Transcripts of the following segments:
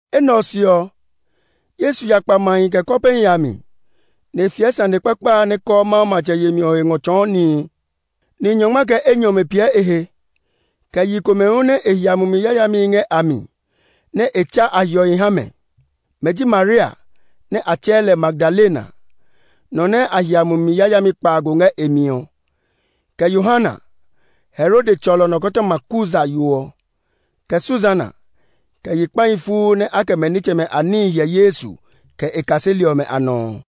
Enɛ ɔ se ɔ, Yesu ya kpa mahi, kɛ kɔpehi a mi, nɛ e fiɛ sane kpakpa a nɛ kɔɔ Mawu matsɛ yemi ɔ he ngɔ tsɔɔ nihi. Ni nyɔngma kɛ enyɔ ɔmɛ piɛ e he, kɛ yi komɛ hu nɛ e hia mumi yayamihi ngɛ a mi, nɛ e tsa a hiɔhi ha mɛ. Mɛ ji Maria (nɛ a tsɛɛ lɛ Magdalena), nɔ nɛ a hia mumi yayami kpaago ngɛ e mi ɔ, kɛ Yohana, Herode tsɔlɔ nɔkɔtɔma Kuza yo ɔ, kɛ Susana, kɛ yi kpahi fuu nɛ a kɛ mɛ nitsɛmɛ a níhi hyɛ Yesu, kɛ e kaseli ɔmɛ a nɔ ɔ.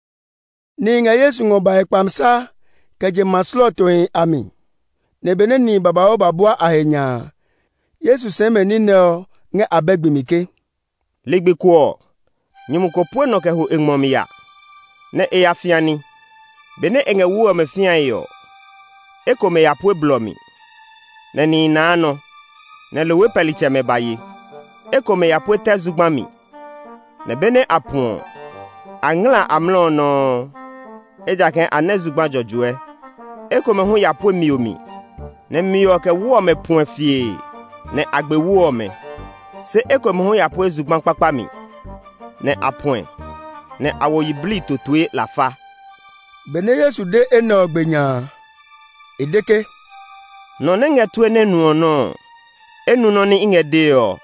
Nihi ngɛ Yesu ngɔ bae kpamisa kɛ je ma slɔɔtohi a mi; nɛ benɛ nihi babauu ba bua a he nya a, Yesu sɛɛ mɛ ní nɛ ɔ ngɛ abɛ gbi mi ke, “Ligbi ko ɔ, nyumu ko pue nɔ kɛ ho e ngmɔ mi ya nɛ́ e ya fĩa ní. Benɛ e ngɛ wu ɔ fĩae ɔ, ekomɛ ya pue blɔ mi, nɛ nihi naa nɔ, nɛ lohwe pɛlitsɛmɛ ba ye. Ekomɛ ya pue tɛ zugba mi, nɛ benɛ a puɛ ɔ, a ngla amlɔ ɔ nɔuu, ejakaa a nɛ zugba jɔjɔɛ. Ekomɛ hu ya pue mio mi, nɛ mio ɔ, kɛ wu ɔmɛ puɛ fiee, nɛ a gbe wu ɔmɛ. Se ekomɛ hu ya pue zugba kpakpa mi, nɛ a puɛ, nɛ a wo yiblii totoe lafa.” Benɛ Yesu de enɛ ɔ gbe nya a, e de ke, “Nɔ nɛ ngɛ tue nɛ nuɔ nɔ ɔ, e nu nɔ́ nɛ i ngɛ dee ɔ!”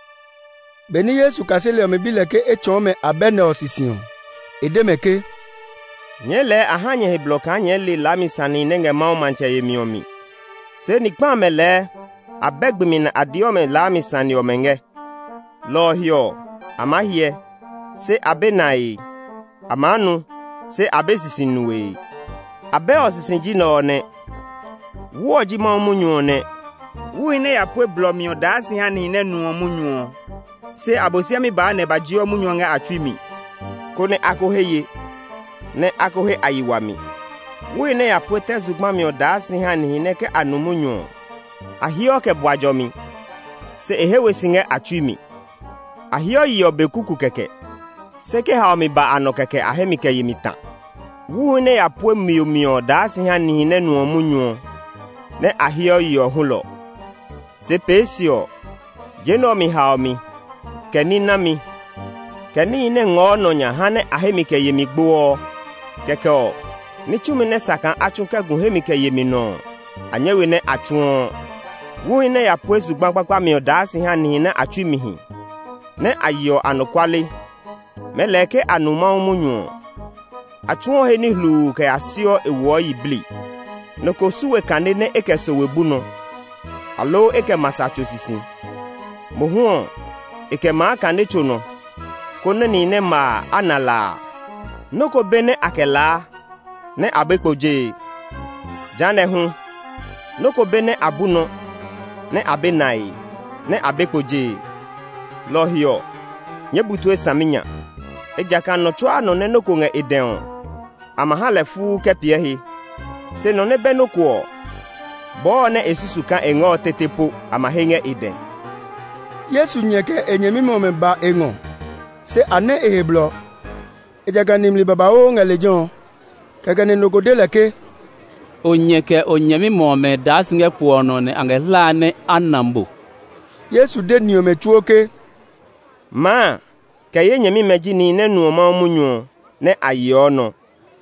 Benɛ Yesu kaseli ɔmɛ bi lɛ ke e tsɔɔ mɛ abɛ nɛ ɔ sisi ɔ, e de mɛ ke, “Nyɛɛ lɛɛ a ha nyɛ he blɔ kaa nyɛɛ le laami sanehi nɛ ngɛ Mawu matsɛ yemi ɔ mi. Se ni kpa amɛ lɛɛ abɛ gbi mi nɛ a deɔ mɛ laami sane ɔmɛ ngɛ. Lɔ ɔ he ɔ, a maa hyɛ, se a be nae; a maa nu se a be sisi nue.” “Abɛ ɔ sisi ji nɛ ɔ nɛ: Wu ɔ ji Mawu munyu ɔ nɛ. Wuhi nɛ ya pue blɔ mi ɔ daa si ha nihi nɛ nuɔ munyu ɔ. Se Abosiami baa nɛ e ba jeɔ munyu ɔ ngɛ a tsui mi, konɛ a ko he ye, nɛ a ko he a yi wami. Wuhi nɛ ya pue tɛ zugba mi ɔ daa si ha nihi nɛ ke a nu munyu ɔ, a heɔ kɛ bua jɔmi, se e he we si ngɛ a tsui mi. A heɔ yeɔ be kuku kɛkɛ, se ke haomi ba a nɔ kɛkɛ a hemi kɛ yemi ta. Wuhi nɛ ya pue mio mi ɔ daa si ha nihi nɛ nuɔ munyu ɔ, nɛ a heɔ yeɔ hulɔ. Se pee se ɔ, je nɛ ɔ mi haomi, kɛ ní nami, kɛ níhi nɛ ngɔɔ nɔ nya haa nɛ a hemi kɛ yemi gboɔ. Kɛkɛ ɔ, ní tsumi nɛ sa kaa a tsu kɛ gu hemi kɛ yemi nɔ ɔ, a nyɛ we nɛ a tsuɔ. Wuhi nɛ ya pue zugba kpakpa mi ɔ daa si ha nihi nɛ a tsui mi hi, nɛ a yeɔ anɔkuale. Mɛɛ lɛɛ ke a nu Mawu munyu ɔ, a tsuɔ he ní hluu kɛ ya siɔ e woɔ yiblii. “Nɔ ko su we kane nɛ e kɛ sowe bu nɔ, aloo e kɛ ma sa tso sisi. Mohu ɔ, e kɛ maa kane tso nɔ, konɛ nihi nɛ ma a, a na la a. “Nɔ́ ko be nɛ a kɛ laa nɛ a be kpo jee; jehanɛ ɔ hu, nɔ́ ko be nɛ a bu nɔ, nɛ a be nae, nɛ a be kpo jee. “Lɔ ɔ he ɔ, nyɛɛ bu tue saminya; ejakaa nɔ tsuaa nɔ nɛ nɔ́ ko ngɛ e dɛ ɔ, a ma ha lɛ fuu kɛ piɛ he. Se nɔ nɛ be nɔ́ ko ɔ, bɔɔ nɛ e susu kaa e ngɛ ɔ tete po a ma he ngɛ e dɛ.” Yesu nyɛ kɛ e nyɛmimɛ ɔmɛ ba e ngɔ, se a nɛ e he blɔ, ejakaa nimli babauu ngɛ lejɛ ɔ. Kɛkɛ nɛ nɔ ko de lɛ ke, “O nyɛ, kɛ o nyɛmimɛ ɔmɛ daa si ngɛ kpo ɔ nɔ, nɛ a ngɛ hlae nɛ a na mo.” Yesu de ni ɔmɛ tsuo ke, “Maa, kɛ ye nyɛmimɛ ji nihi nɛ nuɔ Mawu munyu ɔ, nɛ a yeɔ nɔ.”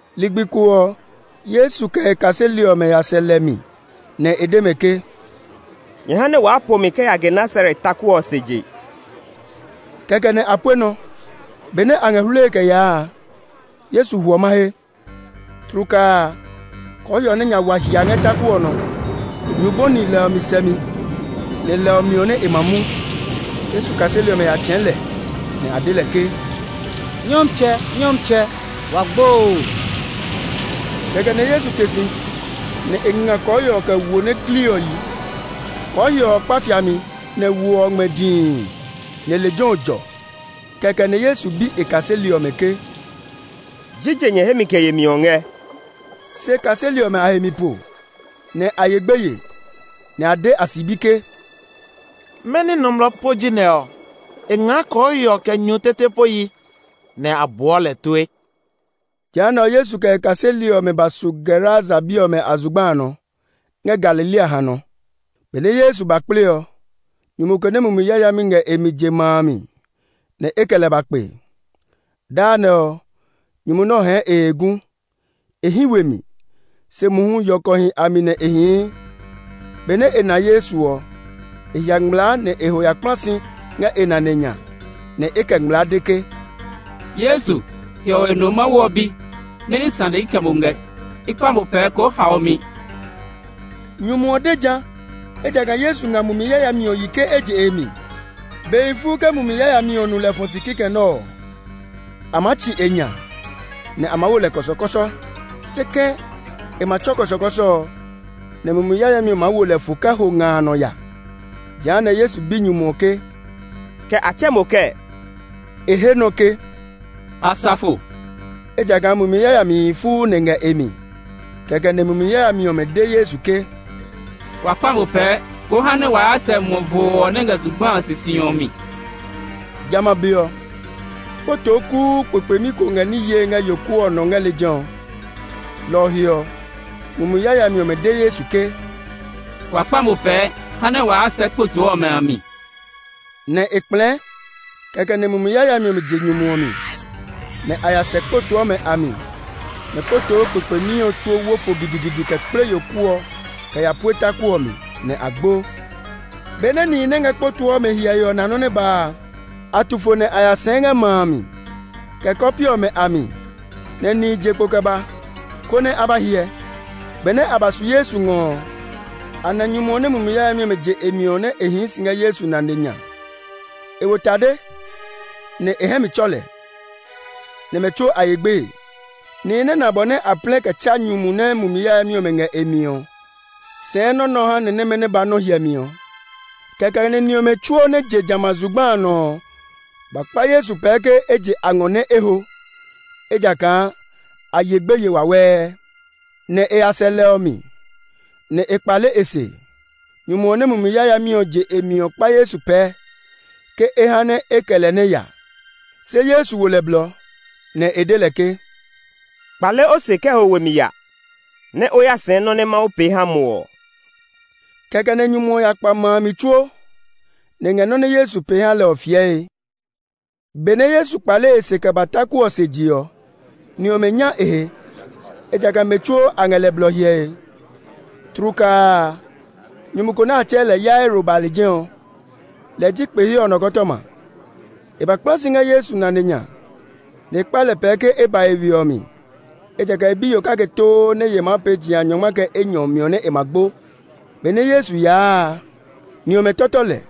Ligbi ko ɔ, Yesu kɛ e kaseli ɔmɛ ya sɛ lɛ mi, nɛ e de mɛ ke, “Nyɛ ha nɛ waa po mi kɛ ya Genesaret taku ɔ se je.” Kɛkɛ nɛ a pue nɔ. Benɛ a ngɛ hluie kɛ yaa a, Yesu hwɔ mahe. Tlukaa a, kɔɔhiɔ nɛ nya wa hia ngɛ taku ɔ nɔ; nyu bɔni lɛ ɔ mi sɛmi, nɛ lɛ ɔ miɔ nɛ e ma mu. Yesu kaseli ɔmɛ ya tsɛ̃ɛ̃ lɛ, nɛ a de ke, “Nyɔmtsɛ, Nyɔmtsɛ! Wa gbo oo!” Kɛkɛ nɛ Yesu te si, nɛ e nga kɔɔhiɔ kɛ wo nɛ gli ɔ yi. Kɔɔhiɔ ɔ kpa fiami, nɛ wo ɔ ngmɛ dii, nɛ lejɛ ɔ jɔ. Kɛkɛ nɛ Yesu bi e kaseli ɔmɛ ke, “Jije nyɛ hemi kɛ yemi ɔ ngɛ?” Se kaseli ɔmɛ a he mi po, nɛ a ye gbeye, nɛ a de a sibi ke, “Mɛni nɔmlɔ po ji nɛ ɔ? E ngaa kɔɔhiɔ, kɛ nyu tete po yi, nɛ a buɔ lɛ tue!” Jehanɛ ɔ, Yesu kɛ e kaseli ɔmɛ ba su Gerasa bi ɔmɛ a zugba a nɔ, ngɛ Galilea hanɔ. Benɛ Yesu ba kple ɔ, nyumu ko nɛ mumi yayamihi ngɛ e mi je ma a mi, nɛ e kɛ lɛ ba kpe. Daa nɛ ɔ, nyumu nɛ ɔ hɛɛ e he gu; e hí we mi, se mohu yɔkɔhi a mi nɛ e hii. Benɛ e na Yesu ɔ, e hia ngmlaa nɛ e ho ya kpla si ngɛ e nane nya, nɛ e kɛ ngmlaa de ke, “Yesu, Hiɔwe Mawu No ɔ Bi! Mɛni sane i kɛ mo ngɛ? I kpa mo pɛɛ, koo hao mi!” Nyumu ɔ de ja, ejakaa Yesu nga mumi yayami ɔ yi ke e je e mi. Behi fuu ke mumi yayami ɔ nu lɛ fɔ si kikɛ nɛ ɔ, a maa tsi e nya, nɛ a maa wo lɛ kɔsɔkɔsɔ. Se kɛ̃, e ma tsɔ kɔsɔkɔsɔ ɔ, nɛ mumi yayami ɔ maa wo lɛ fo kɛ ya nga a nɔ. Jehanɛ ɔ, Yesu bi nyumu ɔ ke, “Kɛ a tsɛɛ mo kɛɛ?” E he nɔ ke, “Asafo”, ejakaa mumi yayamihi fuu lɛ ngɛ e mi. Kɛkɛ nɛ mumi yayami ɔmɛ de Yesu ke, “Wa kpa mo pɛɛ, ko ha nɛ wa ya sɛ muɔ voo ɔ nɛ ngɛ zugba a sisi ɔ mi.” Jamɛ a be ɔ, kpotoo kuu kpekpemi ko ngɛ ní yee ngɛ yoku ɔ nɔ ngɛ lejɛ ɔ. Lɔ ɔ he ɔ, mumi yayami ɔmɛ de Yesu ke, “Wa kpa mo pɛɛ, ha nɛ wa ya sɛ kpotoo ɔmɛ a mi.” Nɛ e kplɛɛ. Kɛkɛ nɛ mumi yayami ɔmɛ je nyumu ɔ mi, nɛ a ya sɛ kpotoo ɔmɛ a mi, nɛ kpotoo kpekpemi ɔ tsuo wo fo gidigidi kɛ kple yoku ɔ kɛ ya pue taku ɔ mi, nɛ a gbo. Benɛ nihi nɛ ngɛ kpotoo ɔmɛ hyɛe ɔ na nɔ́ nɛ ba a, a tu fo nɛ a ya sɛɛ ngɛ ma a mi, kɛ kɔpe ɔmɛ a mi, nɛ nihi je kpo kɛ ba, konɛ a ba hyɛ. Benɛ a ba su Yesu ngɔ ɔ, a na nyumu ɔ nɛ mumi yayami ɔmɛ je e mi ɔ nɛ e hii si ngɛ Yesu nane nya. E wo tade, nɛ e hɛ mi tsɔ lɛ. Nɛ mɛ tsuo a ye gbeye. Nihi nɛ na bɔ nɛ a plɛ kɛ tsa nyumu ɔ nɛ mumi yayami ɔmɛ ngɛ e mi ɔ, sɛɛ nɔ́ nɛ ɔ ha ni nɛmɛ nɛ ba nɔ́ hyɛmi ɔ. Kɛkɛ nɛ ni ɔmɛ tsuo nɛ je jamɛ a zugba a nɔ ɔ, ba kpa Yesu pɛɛ ke e je a ngɔ nɛ e ho, ejakaa a ye gbeye wawɛɛ. Nɛ e ya sɛ lɛ ɔ mi, nɛ e kpale e se. Nyumu ɔ nɛ mumi yayami ɔmɛ je e mi ɔ, kpa Yesu pɛɛ ke e ha nɛ e kɛ lɛ nɛ ya. Se Yesu wo lɛ blɔ, nɛ e de lɛ ke, “Kpale o se kɛ ho we mi ya, nɛ o ya sɛɛ nɔ́ nɛ Mawu pee ha mo ɔ.” Kɛkɛ nɛ nyumu ɔ ya kpa ma a mi tsuo, nɛ e ngɛ nɔ́ nɛ Yesu pee ha lɛ ɔ fiɛe. Benɛ Yesu kpale e se kɛ ba taku ɔ se je ɔ, ni ɔmɛ nya e he, ejakaa mɛ tsuo a ngɛ lɛ blɔ hyɛe. Tlukaa a, nyumu ko nɛ a tsɛɛ lɛ Yairo ɔ ba lejɛ ɔ; lɛ ji kpe he ɔ nɔkɔtɔma. E ba kpla si ngɛ Yesu nane nya, nɛ e kpa lɛ pɛɛ ke e ba e we ɔ mi, ejakaa e biyo kake too nɛ ye maa pee jeha nyɔngma kɛ enyɔ ɔ miɔ nɛ e ma gbo. Benɛ Yesu yaa a, ni ɔmɛ tɔtɔ lɛ.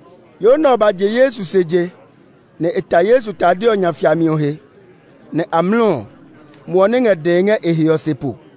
Yo nɛ ɔ ba je Yesu se je, nɛ e ta Yesu tade ɔ nya fiami ɔ he; nɛ amlɔ ɔ, muɔ nɛ ngɛ dɛe ngɛ e he ɔ se po.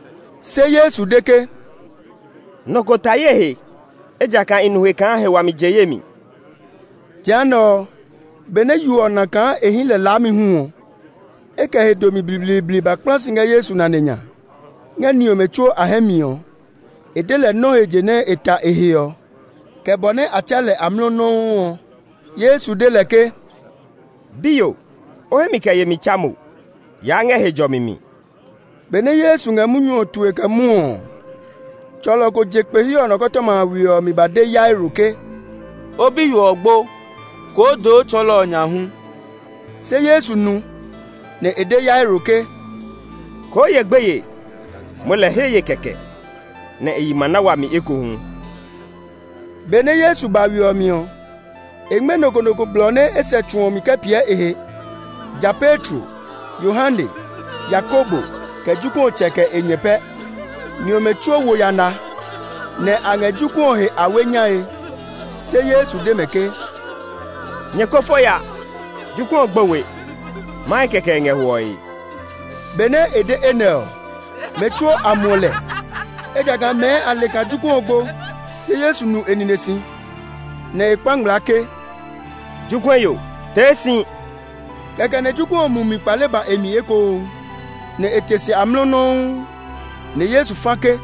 Se Yesu de ke, “Nɔ ko ta ye he, ejakaa i nu he kaa he wami je ye mi.” Jehanɛ ɔ, benɛ yo ɔ na kaa e hí lɛ laami hu ɔ, e kɛ he domi blibliibli ba kpla si ngɛ Yesu nane nya. Ngɛ ni ɔmɛ tsuo a hɛ mi ɔ, e de lɛ nɔ́ he je nɛ e ta e he ɔ, kɛ bɔ nɛ a tsa lɛ amlɔ nɔuu ɔ. Yesu de lɛ ke, “Biyo, o hemi kɛ yemi tsa mo; yaa ngɛ he jɔmi mi.” Benɛ Yesu ngɛ munyu ɔ tue kɛ mwɔɔ ɔ, tsɔlɔ ko je kpe he ɔ nɔkɔtɔma a we ɔ mi ba de Yairo ke, “O biyo ɔ gbo; koo doo Tsɔɔlɔ ɔ nya hu.” Se Yesu nu, nɛ e de Yairo ke, “Koo ye gbeye; moo lɛɛ he ye kɛkɛ, nɛ e yi ma na wami ekohu.” Benɛ Yesu ba we ɔ mi ɔ, e ngmɛ́ nɔ ko nɔ ko blɔ nɛ e sɛ tsu ɔ mi kɛ piɛ e he, ja Petro, Yohane, Yakobo, kɛ jokuɛ ɔ tsɛ kɛ e nyɛ pɛ. Ni ɔmɛ tsuo wo yana, nɛ a ngɛ jokuɛ ɔ he awe nyae. Se Yesu de mɛ ke, “Nyɛ ko fo ya; jokuɛ ɔ gbo we, mahe kɛkɛ nɛ e ngɛ hwɔe!” Benɛ e de enɛ ɔ, mɛ tsuo a muɔ lɛ, ejakaa mɛɛ a le kaa jokuɛ ɔ gbo. Se Yesu nu e nine si, nɛ e kpa ngmlaa ke, “Jokuɛ yo, tee si!” Kɛkɛ nɛ jokuɛ ɔ mumi kpale ba e mi ekohu, nɛ e te si amlɔ nɔuu. Nɛ Yesu fa ke,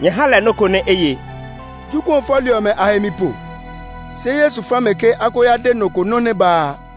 “Nyɛ ha lɛ nɔ́ ko nɛ e ye!” Jokuɛ ɔ fɔli ɔmɛ a he mi po, se Yesu fa mɛ ke a ko ya de nɔ ko nɔ́ nɛ ba a.